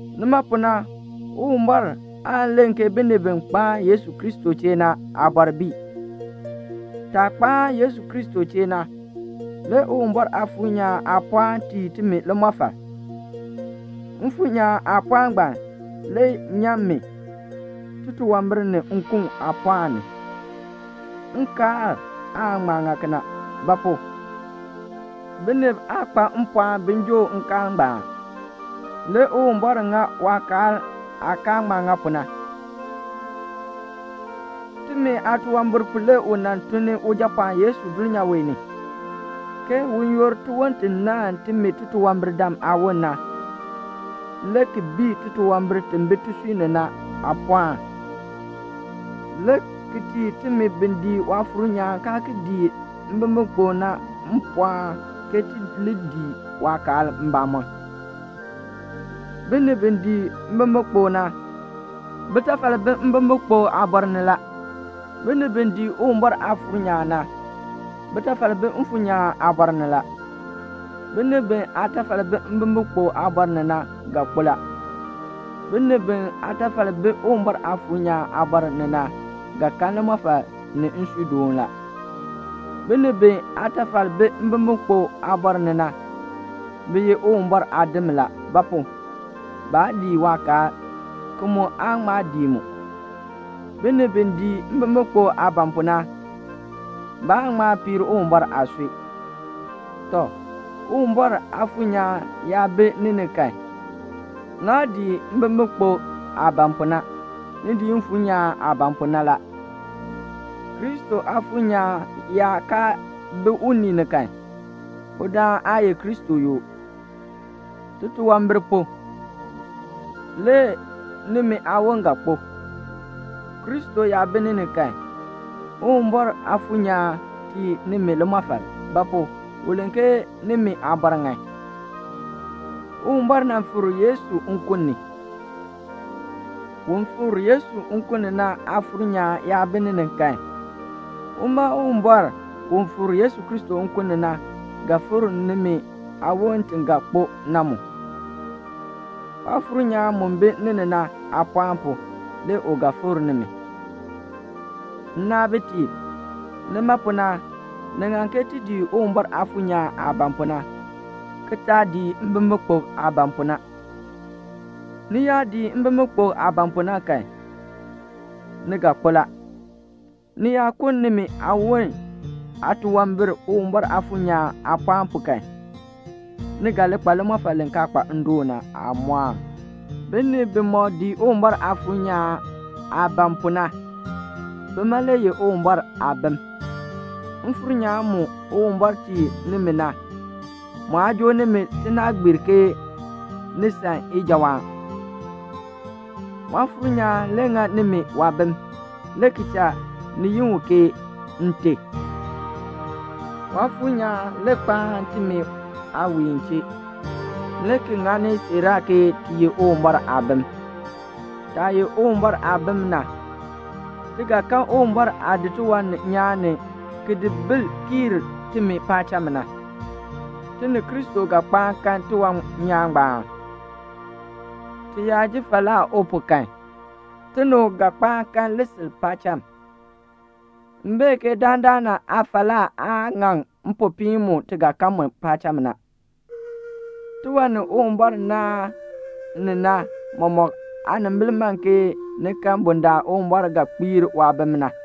Nima pu na Uwumbɔr aan len ke binib bi kpaan Yesu Kristo chee na aabɔr bii. Taah kpaan Yesu Kristo chee na, le Uwumbɔr Aafuur nyaan aapɔɔn tii timi limɔfal; Mfuur nyaan aapɔɔn ngbaan le nyan mi titunwambir ni nkun aapɔɔn ni. Nkaal aa ŋma ŋa kena; ba pu? binib aa kpa mpɔɔn bin joo nkaal ngbaan. Le Uwumbɔr ŋa waakaal aa kaa ŋma ŋa pu na; timi aatunwambir pu le u nan tun ni Ujapɔɔn Yesu dulnyaa wee ni, ke un yoor tiwon ti naahn timi titunwambirdam aawon na, le ki bii titunwambir ti bi tisui ni na aapɔɔn, le ki tii timi bi dii Waafuur nyaan kaa ki dii mbimbikpok na mpɔɔn ke ti li dii waakaal mbamɔm. Binib bi dii mbimbikpok na, bitafal bi mbimbikpok aabɔr ni la. Binib bi dii Uwumbɔr Aafuur nyaan na, bitafal bi Mfuur nyaan aabɔr ni la. Binib bi aatafal bi mbimbikpok aabɔr ni na ga kpo la. Binib bi aatafal bi Uwumbɔr Aafuur nyaan aabɔr ni na ga kan limɔfal ni nsuudoon la. Binib bi aatafal bi mbimbikpok aabɔr ni na, bi ye Uwumbɔr aadim la; ba pu? baa dii waakaal, ki mu aa ŋma dii mu. Binib bi dii mbimbikpok aah ban pu na, baan ŋma piir Uwumbɔr aasui. Tɔ, Uwumbɔr Aafuur nyaan yaa bi ni ni kan, naa dii mbimbikpok aah ban pu na, ni dii Mfuur nyaan aah ban pu na la. Kristo Aafuur nyaan yaa kaa bi unii ni kan, udaan aa ye Kristo yoo. Titunwambir pu, le nimi aawon ga kpo. Kristo yaa bi ni ni kan, Uwumbɔr Aafuur nyaan tii nimi limɔfal; ba pu? u len ke nimi aabɔr ŋan. Uwumbɔr nan fikr Yesu nkun ni. Un fikr Yesu nkun ni na Aafuur nyaan yaa bi ni ni kan, uma Uwumbɔr u fikr Yesu Kristo nkun ni na ga fikr nimi aawon ti ga kpo na mu. Waafuur nyaan mu bi ni ni na aapɔɔn pu, le u ga fikr nimi. Nnaabitiib, nima pu na, ni ŋan ke ti dii Uwumbɔr Aafuur nyaan aah ban pu na, ki taa dii mbimbikpok aah ban pu na. Ni yaa dii mbimbikpok aah ban pu na kan, ni ga kpo la. Ni yaa kuln nimi aawon aatunwambir Uwumbɔr Aafuur nyaan aapɔɔn pu kan, ni ga li kpa limɔfal li kaa kpa ndoon na aamɔɔn. Binib bimɔk dii Uwumbɔr Aafuur nyaan aah ban pu na, bima le ye Uwumbɔr aabim. Mfuur nyaan mu Uwumbɔr tii nimi na, mu aa joo nimi tinaagbiir ke ni san ijawaan. Waafuur nyaan le ŋa nimi waabim, le ki cha ti yi u ke "Nte." Waafuur nyaan le kpaan timi aawiin chee, le ki ŋani siiraa ke ti ye Uwumbɔr aabim. Taah ye Uwumbɔr aabim na, ti ga kan Uwumbɔr aah di tiwan nyaan ni ki di bil kiir timi paacham na. Ti ni Kristo ga kpaan kan tiwan nyaan ngbaan. Ti yaa ji falaa u pu kan, ti ni u ga kpaan kan lisil paacham. M bee ke dandana aafalaa aa ŋaŋ mpopiin mu ti ga kan mu paacham na. Tiwan ni Uwumbɔr naan ni na mɔmɔk aanimbil man ke ni kan bundaln Uwumbɔr ga kpiir waabim na.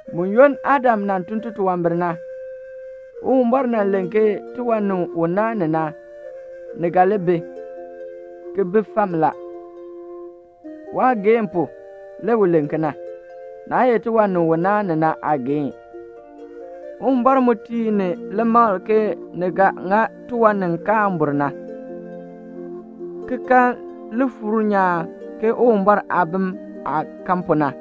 Buyoonn Adam nan tun titunwambir na, Uwumbɔr nan len ke tiwan ni u naan ni na, ni ga li bi, ki bi fam la. Waageehn pu, le u len kena. Naa ye tiwan ni u naan ni na aageehn. Uwumbɔr mu tii ni limakl ke ni ga ŋa tiwan ni kaan bur na, ki kan lifuur nyaan ke Uwumbɔr aabim aah kan pu na.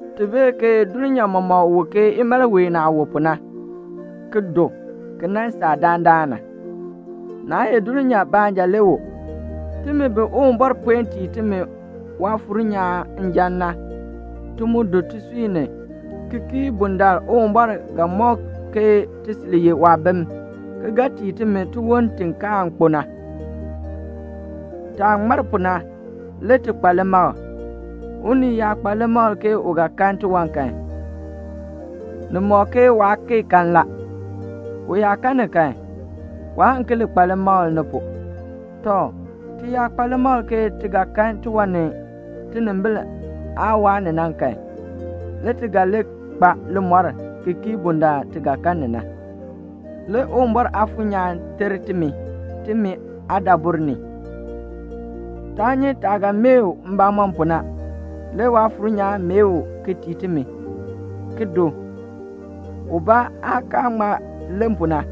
Ti bee ke dulnyaa mɔmɔk wu ke imalween aah wu pu na, ki du ki nan saa dandana. Naa ye dulnyaa baanja le wu; timi bi Uwumbɔr puen tii timi Waafuur nyaan njan na, ti mu du tisui ni, ki kii bundaln Uwumbɔr ga mɔk ke ti sil ye waabim, ki ga tii timi tiwon ti kaan kpo na. Taah ŋmar pu na, le ti kpa limakl. Unii yaa kpa limakl ke u ga kan tiwan kan, ni ŋmɔk ke waa kee kan la. U yaa kan ni kan, waan ki li kpa limakl ni pu. Tɔ, ti yaa kpa limakl ke ti ga kan tiwan ni tinimbil aa waa ni na kan, le ti ga li kpa limɔr ki kii bundaln ti ga kan ni na. Le Uwumbɔr Aafuur nyaan ter timi, timi aadabur ni. Taa nyi taah ga mee u mbamɔm pu na. Le Waafuur nyaan mee u ki tii timi, ki du, ubaa aah kaa ŋma len pu na.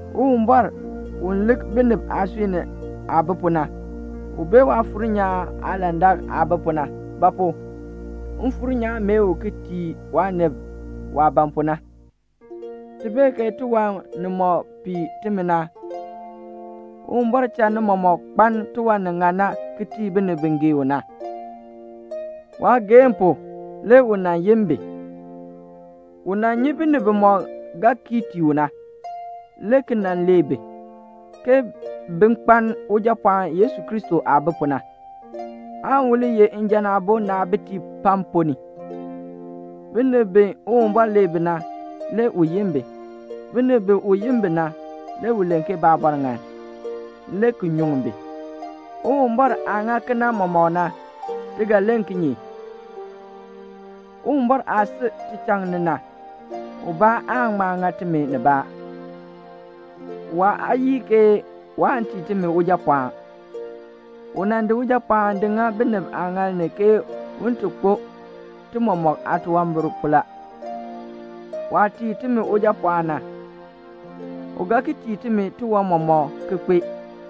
Uwumbɔr, u lik binib aasui ni aah bi pu na, u bee Waafuur nyaan aalandak aah bi pu na; ba pu? Mfuur nyaan mee u ki tii waanib waah ban pu na. Ti bee ke tiwan nimɔk pii timi na, Uwumbɔr cha ni mɔmɔk kpaln tiwan ni ŋan na ki tii binib bi gee u na. Waageehn pu le u nan yin bi. U nan nyi binib bimɔk ga kii tii u na, le ki nan lee bi, ke bi li kpaln Ujapɔɔn Yesu Kristo aah bi pu na, aan u li ye njan aabo naabitiib pam ponn ni. Binib bi Uwumbɔr lee bi na, le u yin bi. Binib bi u yin bi na, le u len ke baabɔr ŋan, le ki nyuŋ bi. Uwumbɔr aah ŋa kena na mɔmɔk, ti ga len kinye? Uwumbɔr aah si tichaŋ ni na, ubaa aan ŋma ŋa timi nibaa. Waa yii ke waan tii timi Ujapɔɔn. U nan di Ujapɔɔn di ŋa binib aaŋaal ni ke un ti kpo ti mɔmɔk aatunwambir pu la. Waah tii timi Ujapɔɔn na, u ga ki tii timi tiwan mɔmɔk ki kpee.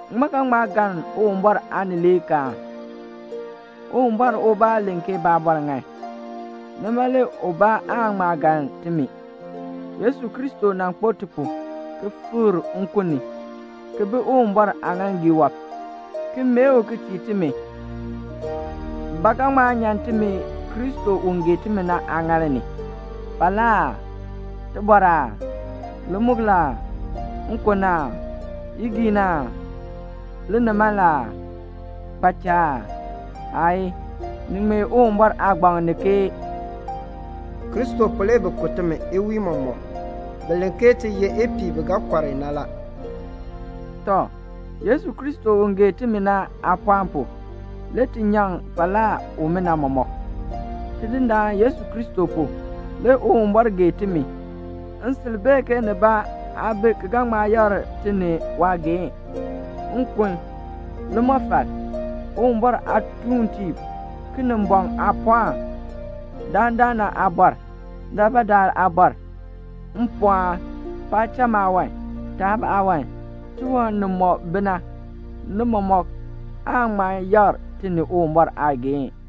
Ŋmaa ga ŋma galn Uwumbɔr aanileekaan? Uwumbɔr ubaa len ke baabɔr ŋan. Nima le ubaa aan ŋma galn timi. Yesu Kristo nan kpo ti pu, ki fikr nkun ni, ki bi Uwumbɔr aaŋaaŋgii wɔb, ki mee u ki tii timi. Ba ga ŋma nyan timi Kristo u gee timi na aaŋaal ni? Falaa aa? Tibɔr aa? Limukl aa? Nkon aa? Igiin aa? Linimaln aa? Kpaacha aa? Aayii. Ni ŋmee Uwumbɔr Aagbaŋ ni ke "Kristo pu le bi ku timi iwiin mɔmɔk. Bi len ke ti ye ipiih i bi ga kɔr i na la." Tɔ, Yesu Kristo u gee timi na aapɔɔn pu, le ti nyaŋ falaa umina mɔmɔk. Tidindaan Yesu Kristo pu, le Uwumbɔr gee timi. M sil bee ke nibaa aa bi ki ga ŋma yakr ti ni waageehn. Nkun, limɔfal, Uwumbɔr aatuuntiib, Kinimbɔŋ aapɔɔn, dandana aabɔr, daalbaadaal aabɔr, mpɔɔn, paacham aawan, taab aawan, tiwan nimɔk bi na, ni mɔmɔk aan ŋma yakr ti ni Uwumbɔr aageehn.